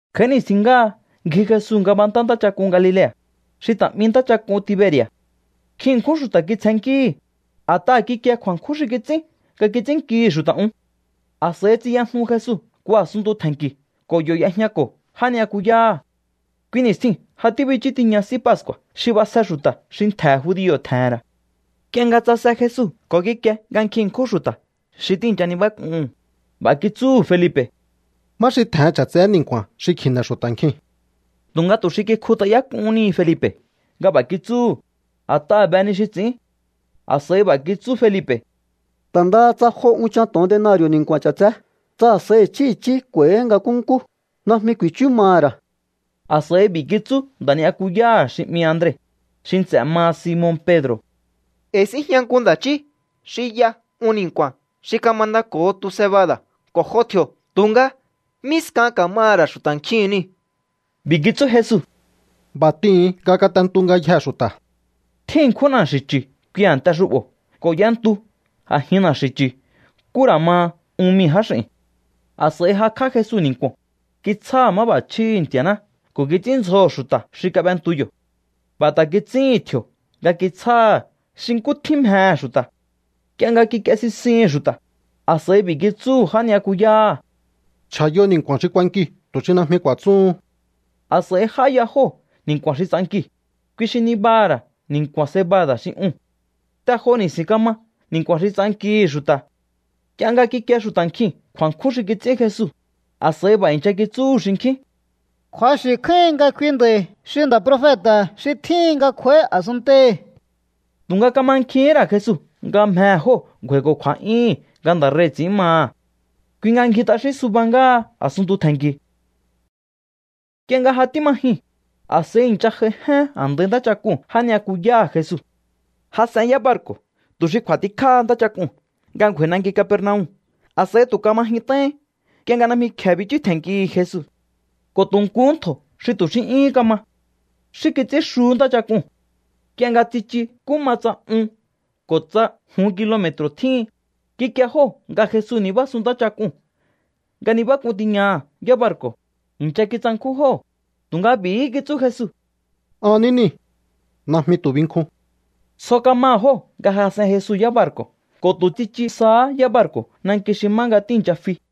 Kj'a̱í ni̱stjin ngáha ngji Jesu ngabantá ntáchak'un Galilea̱, xi ta̱ 'mi ntáchak'un Tiberi̱a̱. Nkjin ṉkjún xu̱ta̱ kitsjennkíhi̱, a̱t'aha̱ kikie kju̱a̱nkjún xi kits'ín nga kits'ínnkihi̱ xu̱ta̱ un. A̱s'a̱i tsiyajnu Jesu nku a̱sunntu tje̱nki̱ ko̱ yo̱ y'ejñako̱ já ni'yakuyáha̱. Kui ni̱stjiu̱n ja tíbichú tiña S'í Pascu̱a̱ xi b'asje xu̱ta̱ xi ntje̱ judio̱ tje̱he̱n ra̱. Nk'ie nga tsase Jesu ko̱ kikie nga nkjin ṉkjún xu̱ta̱ xi tíi̱ncha nibák'uhu̱n, b'a̱ kitsúhu̱ Felipe̱: —¿Má xi tje̱hen ch'a̱tseé ni̱nku̱a̱n xi kji̱ne̱ xu̱ta̱ nkiu̱n? Tu̱nga tu̱ xi kikjut'ayák'uhún ni Felipe̱ nga b'a̱ kitsúhu̱, a̱t'aha̱ be ni xi ts'i̱ín. A̱s'a̱i b'a̱ kitsú Felipe̱: —Ta̱ ndaha tsa jo unchan to̱on denari̱o̱ ni̱nku̱a̱n ch'a̱tseé, tsa a̱s'a̱i i̱chí i̱chí k'u̱a̱i̱hi̱ nga nkúnkú, najmi ku̱i̱chú maha̱ ra̱. A̱s'a̱i b'i̱ kitsú nda̱ ni'yakuyá xi 'mi Andre, xi nts'e̱ maha Simon Pedro̱: —E̱i̱ síjña nku nda̱ chí xi y'a un ni̱nku̱a̱n xi kamandako̱ho tu cebada̱ ko̱ jo tji̱o̱. Tu̱nga, ¿mí skan ka̱maha̱ ra̱ xu̱ta̱ nkjiu̱n niu̱? B'i̱ kitsú Jesu: —B'a̱ t'ihu̱un nga kat'entu ngayjee̱ xu̱ta̱. Tjín ṉkjún na̱xi̱ chu̱ kui a̱nte xu'bo̱ ko̱ y'entu a̱jin na̱xi̱ chu̱ nkú ra̱ ma un mii̱ jáx'i̱n. A̱s'a̱i jakj'á Jesu ni̱nku̱o̱n, kitsjáha̱ máb'a̱chjíhi̱ Nti̱a̱ná ko̱ kits'ínndzjoho̱ xu̱ta̱ xi kab'entu yo̱. B'a̱ ta̱ kits'íhi̱n tji̱o̱ nga kitsjáha̱ xi nkú tjín mjehe̱ xu̱ta̱. Nk'ie nga kik'ie sisihi̱n xu̱ta̱, a̱s'a̱i b'i̱ kitsúhu̱ já ni'yakuyáha̱: —Chj'a̱yo ni̱nku̱a̱n xi k'uankiu̱ tu̱ xi najmi ku̱a̱tsúhun. A̱s'a̱i j'áya jóo̱ ni̱nku̱a̱n xi ts'ankiu̱, kui xi nibaha̱ ra̱ ni̱nku̱a̱n cebada̱ xi uu̱n. Te jo ni̱si̱n kama ni̱nku̱a̱n xi ts'ankihi̱ xu̱ta̱. Nk'ie nga kikie xu̱ta̱ nkjiu̱n kju̱a̱nkjún xi kits'ín Jesu, a̱s'a̱i b'a̱ i̱ncha kitsúhu̱ xinkjín: —Kju̱axi̱ kjáíhin nga kui nda̱i̱ xi nda̱ profeta̱ xi tjíhin nga kj'u̱a̱í a̱sunntei̱. Tu̱nga kamankjihín ra̱ Jesu nga mjehe̱ jóo̱ ngju̱a̱i̱ko̱ kju̱a̱'yúhu̱n nga nda̱ rei̱ ts'i̱ín maha̱. Kui nga ngji t'axín suba ngáha a̱suntu tje̱nki̱u̱. Nk'ie nga ja tíma jyun, a̱s'a̱i i̱ncha j'aijen a̱ndai ntáchak'uu̱n já ni'yakuyáha̱ Jesu. Jas'en yábarku̱ tu̱ xi kj'u̱a̱tikjáha ntáchak'uu̱n nga ngju̱a̱i̱ nanki Capernaum. A̱s'a̱i tu̱ kama jyunt'aihín nk'ie nga najmi kje̱e bichú tje̱nnkihi̱ Jesu. Ko̱ tu̱ nkuhú ntjo̱ xi tu̱ xí 'yúhún kama. Xí kits'ín xuhú ntáchak'uu̱n. Nk'ie nga tsichu nkú ma tsa un ko̱ tsa jun kilome̱tru̱ tjíhin, kikie jóo̱ nga Jesu nibásun ntáchak'uu̱n nga nibák'un tiñaha̱ yábarku̱. I̱ncha kitsankjún jóo̱, tu̱nga b'i̱hí kitsú Jesu: —An ní niu̱. Najmi tu̱ binkjun. Tsjo kamaha̱ jóo̱ nga jas'en Jesu yábarku̱ ko̱ tu̱ tsichu sahá yábarku̱ nanki xi má nga tíi̱ncha fi.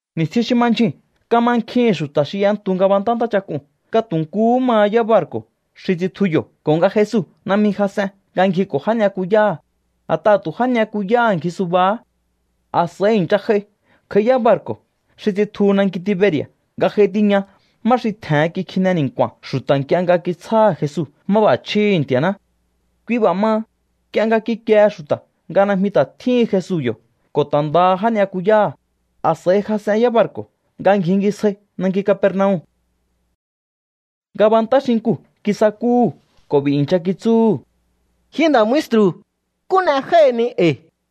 Ni̱stjin xi ma ndyjuu̱n kamankjihi̱n xu̱ta̱ xi y'entu ngabantá ntáchak'uu̱n nga tu̱ nkuhú maha yábarku̱ xi tsitju yo̱ ko̱ nga Jesu najmi jas'en nga ngjiko̱ já ni'yakuyáha̱, a̱t'aha̱ tu̱ já ni'yakuyáha̱ ngji subahá. A̱s'a̱i i̱ncha j'ai kj'a̱í yábarku̱ xi tsitjuhu nanki Tiberi̱a̱ nga j'ai tiña má xi tje̱hen kikjine ni̱nku̱a̱n xu̱ta̱ nk'ie nga kitsjáha̱ Jesu máb'a̱chjíhi̱ Nti̱a̱ná. Kui b'a̱ maha, nk'ie nga kikiehe xu̱ta̱ nga najmi ta̱ tjíhin Jesu yo̱ ko̱ ta̱ ndaha já ni'yakuyáha̱, a̱s'a̱i jas'en yábarku̱ nga ngjingisjai nanki Capernaum. Ngabantá xinkuu̱ kisakúhu̱ ko̱ b'i̱ i̱ncha kitsúhu̱: —Ji nda̱ maestru̱, ¿nkú n'e jái̱hini e̱i̱?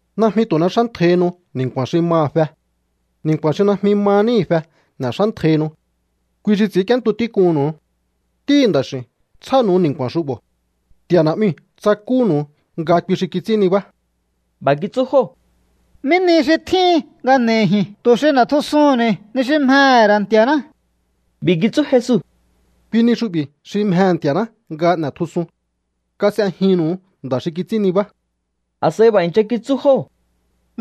Najmi tu̱ n'exántjaihinu ni̱nku̱a̱n xi maha̱ fe. Ni̱nku̱a̱n xi najmi ma níhi̱ fe n'e̱xántjaihinu. Kui xi ts'i̱ínk'íéntu tík'unnu̱u. Ntíhi̱ Nda̱x'i̱u̱n tsjánu̱u ni̱nku̱a̱n xu'bo̱. Nti̱a̱ Na̱'miu̱ tsakúnu̱u nga kui xi kits'ín nibá. B'a̱ kitsú jóo̱: —¿Mí ni xi tjíhin nga n'e̱i̱ ji̱n tu̱ xi n'e̱tjusuhu̱nni̱ ni xi mjehe̱ ra̱ Nti̱a̱ná? B'i̱ kitsú Jesu: —Kui ni xu'bi̱ xi mjehe̱ Nti̱a̱ná nga n'e̱tjusun. Kas'ejinnu̱u nda̱ xi kits'ín nibá. A̱s'a̱i b'a̱ i̱ncha kitsú jóo̱: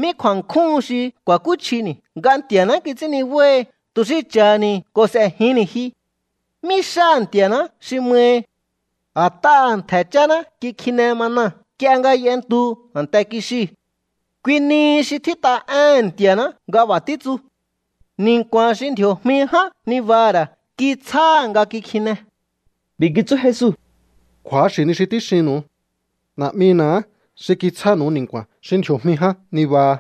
—¿Mí kju̱a̱nkjúhun xi ku̱a̱kúchjini̱ nga Nti̱a̱ná kits'ín nibáhi tu̱ xi cha̱ha̱ni̱ ko̱ s'e̱jinni̱ ji? ¿Mí xáha̱ Nti̱a̱ná xi mahi? A̱t'aha̱ ntje̱ cháná kikjine mana nk'ie nga y'entu a̱nte kixiu̱. Kui nihi xi tjít'a éhe̱n Nti̱a̱ná nga b'a̱ títsu: “Ni̱nku̱a̱n xi ndji̱o̱jmi ján nibaha̱ ra̱ kitsjáha̱ nga kikjine.” B'i̱ kitsú Jesu: —Kju̱axi̱ ni xi tíxinnu̱u. Na̱'mina̱há xi kitsjánu̱u ni̱nku̱a̱n xi ndji̱o̱jmi ján nibaha,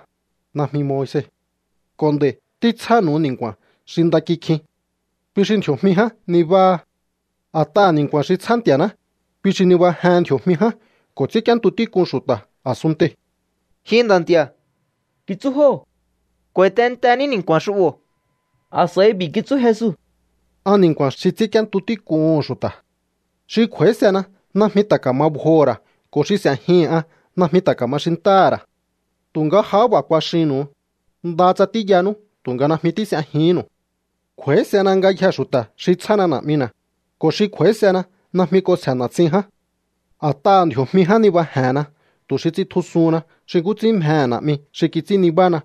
najmi Moise. Ko̱ nd'a̱i̱ títsjánu̱u ni̱nku̱a̱n xi nda kjikjin. Kui xi ndji̱o̱jmi ján nibáha. A̱t'aha̱ ni̱nku̱a̱n xi tsjá Nti̱a̱ná, kui xi nibajehen ndji̱o̱jmi ján ko̱ ts'ínk'íéntu tík'un xu̱ta̱ a̱sunntei̱. —Ji nda̱ nti̱a̱ —kitsú jóo̱—, k'u̱a̱i̱ tehe̱nteni̱ ni̱nku̱a̱n xu'bo̱. A̱s'a̱i b'i̱ kitsú Jesu: —An ni̱nku̱a̱n xi ts'ínk'íéntu tík'uhu̱n xu̱ta̱. Xi kj'u̱a̱ísena najmi ta̱ ka̱ma bjoho̱ ra̱ ko̱ xi s'e̱jihi̱n an najmi ta̱ ka̱ma xintáha̱ ra̱. Tu̱nga jahá b'a̱ kuaxinnu̱u, ndaha tsa tíyanú tu̱nga najmi tís'ejihínnu̱u. Kj'u̱a̱ísena ngayjee̱ xu̱ta̱ xi tsjána Na̱'mina̱, ko̱ xi kj'u̱a̱ísena najmi k'onsje̱ na̱tsin ján. ’A̱t'aha̱ ndji̱o̱jmi ján nibaje̱henna tu̱ xi ts'intjusuhunna xi nkú ts'ín mjehe̱ Na̱'mi xi kits'ín nibána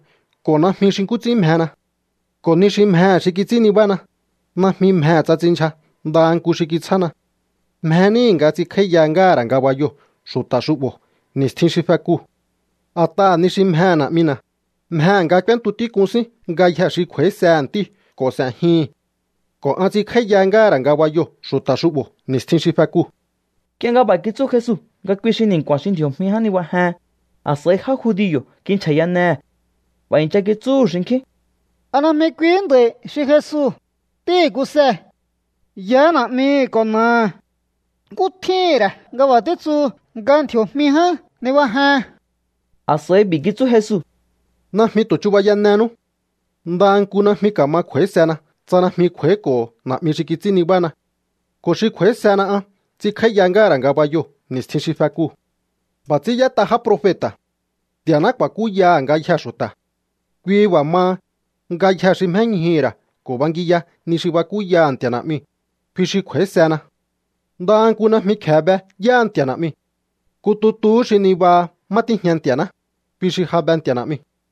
ko̱ najmi xi nkú ts'ín mjena. Ko̱ ni xi mjehe̱ xi kits'ín nibána, najmi mjehe̱ tsa ts'inndyja ndaha nku xi kitsjána. Mje níhi̱ nga ts'inkj'áíya ngáha̱ ra̱ ngabayoo̱ xu̱ta̱ xu'bo̱ ni̱stjin xi fekuu̱. A̱t'aha̱ ni xi mjehe̱ Na̱'mina̱, mjehe̱ nga k'úéntu tík'un sín ngayjee̱ xi kj'u̱a̱ísehe̱ Ntíu̱ ko̱ s'e̱jihi̱n. Ko̱ an ts'inkj'áíya ngáha̱ ra̱ ngabayoo̱ xu̱ta̱ xu'bo̱ ni̱stjin xi fekuu̱. Nk'ie nga b'a̱ kitsú Jesu nga kui xi ni̱nku̱a̱n xi ndji̱o̱jmi ján nibajehen, a̱s'a̱i já judio̱ kinchja̱yanehe̱. B'a̱ i̱ncha kitsúhu̱ xinkjín: —¿A najmi kuihí nda̱i̱ xi Jesu, ntíhi̱ Kuse? Yaá na̱'mihi̱ ko̱ na̱aha̱. ¿Nkú tjíhi̱n ra̱ nga b'a̱ títsuhu nga ndji̱o̱jmi ján nibajehen? A̱s'a̱i b'i̱ kitsú Jesu: —Najmi tu̱ chubayanenú. Ndaha nku najmi ka̱ma kj'u̱a̱ísena tsa najmi kj'u̱a̱íko̱ho̱ Na̱'mi xi kits'ín nibána. Ko̱ xi kj'u̱a̱ísena an ts'inkj'áíya ngáha̱ ra̱ ngabayoo̱ ni̱stjin xi fekuu̱. B'a̱ ts'ín y'ét'a já profeta̱: “Nti̱a̱ná ku̱a̱kúyaha̱ ngayjee̱ xu̱ta̱.” Kui b'a̱ maha, ngayjee̱ xi mjéñjuhu̱ ra̱ ko̱ bangiya ni xi bakúyaha̱ Nti̱a̱ Na̱'miu̱, kui xi kj'u̱a̱ísena. ’Ndaha nku najmi kje̱e be yáha Nti̱a̱ Na̱'miu̱. Nku tutuhú xi nibaha má tíjña Nti̱a̱ná, kui xi ja be Nti̱a̱ Na̱'miu̱.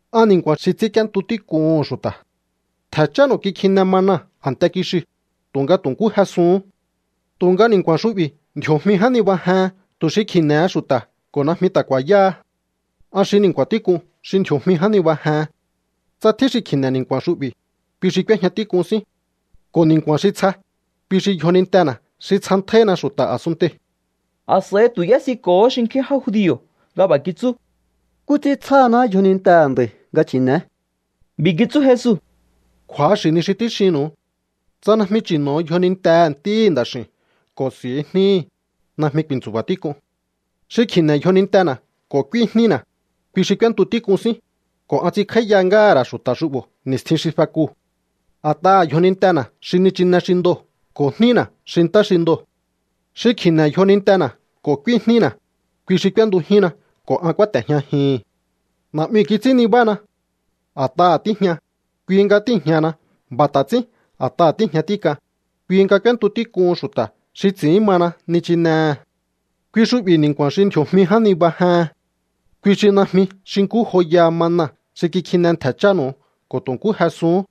An ni̱nku̱a̱n xi ts'ínk'íéntu tík'uhu̱n xu̱ta̱. Ntje̱ chánu̱u kikjine mana a̱nte kixiu̱, tu̱nga tu̱ nkú jesuhún. Tu̱nga ni̱nku̱a̱n xu'bi̱ ndji̱o̱jmi ján nibajehen tu̱ xi kji̱ne̱he xu̱ta̱ ko̱ najmi ta̱ ku̱a̱yáha. An xi ni̱nku̱a̱n tík'un xi ndji̱o̱jmi ján nibajehen. Tsa tjín xi kji̱ne̱ ni̱nku̱a̱n xu'bi̱, kui xi k'úéjña tík'un sín. Ko̱ ni̱nku̱a̱n xi tsja, kui xi yjonintena̱ xi tsjantjáíhina xu̱ta̱ a̱sunntei̱. A̱s'a̱i tu̱ y'ésiko̱hó xinkjín já judio̱ nga b'a̱ kitsú: —¿Nkú ts'ín tsjáhaná yjonintehe̱ nda̱i̱ nga chi̱ne̱é? B'i̱ kitsú Jesu: —Kju̱axi̱ ni xi tíxinnu̱u. Tsa najmi chi̱no̱o yjonintehe̱ Ntíhi̱ Nda̱x'i̱u̱n ko̱ s'i̱u jníhi̱, najmi ku̱i̱ntsu̱ba̱ tík'un. Xi kji̱ne̱ yjonintena̱ ko̱ k'úí jnína̱, kui xi k'úéntu tík'un sín, ko̱ an ts'inkj'áíya ngáha̱ ra̱ xu̱ta̱ xu'bo̱ ni̱stjin xi fekuu̱. A̱t'aha̱ yjonintena̱ xi nichine xi ndoo̱ ko̱ jnína̱ xi ntá xi ndoo̱. Xi kji̱ne̱ yjonintena̱ ko̱ k'úí jnína̱, kui xi k'úéntujínna ko̱ an kúáte̱jñajihi̱n. ’Na̱'miu̱ kits'ín nibána. A̱t'aha̱ tíjña, kui nga tíi̱jñahana. B'a̱ ta̱ ts'ín a̱t'aha̱ tíi̱jña tík'an, kui nga k'úéntu tík'uhun xu̱ta̱ xi ts'i̱ín mana nichinehe̱. Kui xu'bi̱ ni̱nku̱a̱n xi ndji̱o̱jmi ján nibajehen. Kui xi najmi xi nkú joyaha mana xi kikjine ntje̱ chánu̱u ko̱ tu̱ nkú jesuhún.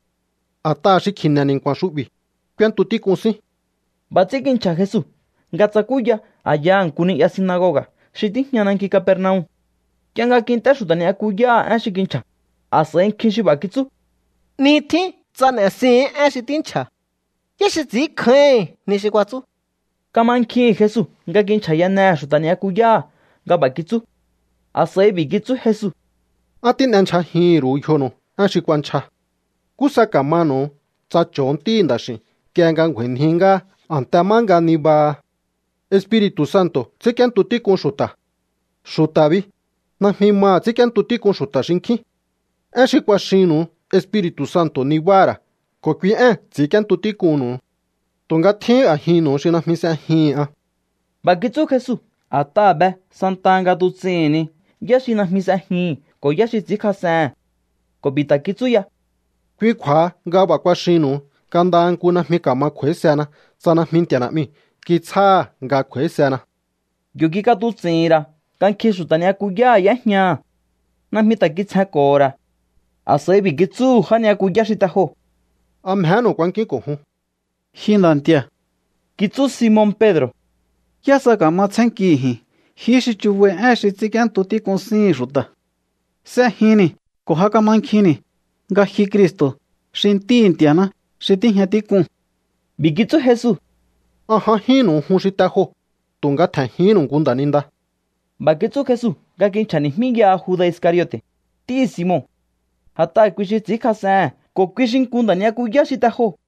A̱t'aha̱ xi kji̱ne̱ ni̱nku̱a̱n xu'bi̱, k'úéntu tík'un sín. B'a̱ ts'ín kinchja̱ Jesu nga tsakúya a̱yaha̱ nku ni'ya sinagoga̱ xi tíjña nanki Capernaum. Nk'ie nga kint'é xu̱ta̱ ni'yakuyáha̱ én xi kinchja̱, a̱s'a̱i nkjin xi b'a̱ kitsú: —'Ni tjín tsa n'e̱sihi̱n én xi tínchja̱. ¿Yá xi ts'i̱ínkjáíhi̱n ni xi kuatsú? Kamankjihi̱n Jesu nga kinchja̱yanehe̱ xu̱ta̱ ni'yakuyáha̱ nga b'a̱ kitsú. A̱s'a̱i b'i̱ kitsú Jesu: —¿A tín'endyjajihín ru̱u yjonu̱u én xi kuanchja? ¿Nkú sa ka̱manu̱u tsa cho̱o Ntíhi̱ Nda̱x'i̱u̱n nk'ie nga ngju̱a̱i̱nji ngáha a̱nte má nga nibaha? Espiri̱tu̱ Santo̱ ts'ínk'íéntu tík'un xu̱ta̱. Xu̱ta̱ bi, najmi maha̱ ts'ínk'íéntu tík'un xu̱ta̱ xinkjín. Én xi kuaxinnu̱u Espiri̱tu̱ Santo̱ nibáha̱ ra̱ ko̱ kui ée̱n ts'i̱ínk'íéntu tík'unnu̱u. Tu̱nga tjín a̱jinnu̱u xi najmi s'ejihi̱n an. B'a̱ kitsú Jesu a̱t'aha̱ be santaha nga tuts'ihi̱n ni yá xi najmi s'ejihi̱n ko̱ yá xi ts'i̱ínkjas'ehe̱n. Ko̱ b'i̱ ta̱ kitsú ya: —Kui kju̱a̱ha nga b'a̱ kuaxihi̱nnu̱u nga ndaha nku najmi ka̱ma kj'u̱a̱ísehena tsa najmi Nti̱a̱ Na̱'miu̱ kitsjáha̱ nga kj'u̱a̱ísena. Yo̱ kik'atuts'i̱hi̱n ra̱ nga nkjin xu̱ta̱ ni'yakuyáha̱ y'éjñaha̱. Najmi ta̱ kitsjenko̱ho̱ ra̱. A̱s'a̱i b'i̱ kitsúhu̱ já ni'yakuyá xi te joo̱: —¿A mjenu̱u kuankíún ko̱ jun? —Ji Nda̱ Nti̱a̱ —kitsú Simon Pedro̱—, ¿yá sa ka̱ma tsjénnkihi̱ ji̱n? Jihí xi chubai én xi ts'ínk'íéntu tík'un síhi̱n xu̱ta̱. S'ejinni̱ ko̱ ja kamankjinni̱ nga ji Cristo̱, xi Ntíhi̱ Nti̱a̱ná xi tíjña tík'uu̱n. B'i̱ kitsú Jesu: —An j'ajínnu̱u jun xi te joo̱, tu̱nga tje̱njihínnu̱u nku nda̱ninda. B'a̱ kitsú Jesu nga kinchja̱ni̱jmíyaha Juda̱ Iscariote̱, ntíhi̱ Simon. A̱t'aha̱ kui xi ts'i̱ínkjas'ehe̱n ko̱ kui xi nku nda̱ ni'yakuyá xi te joo̱.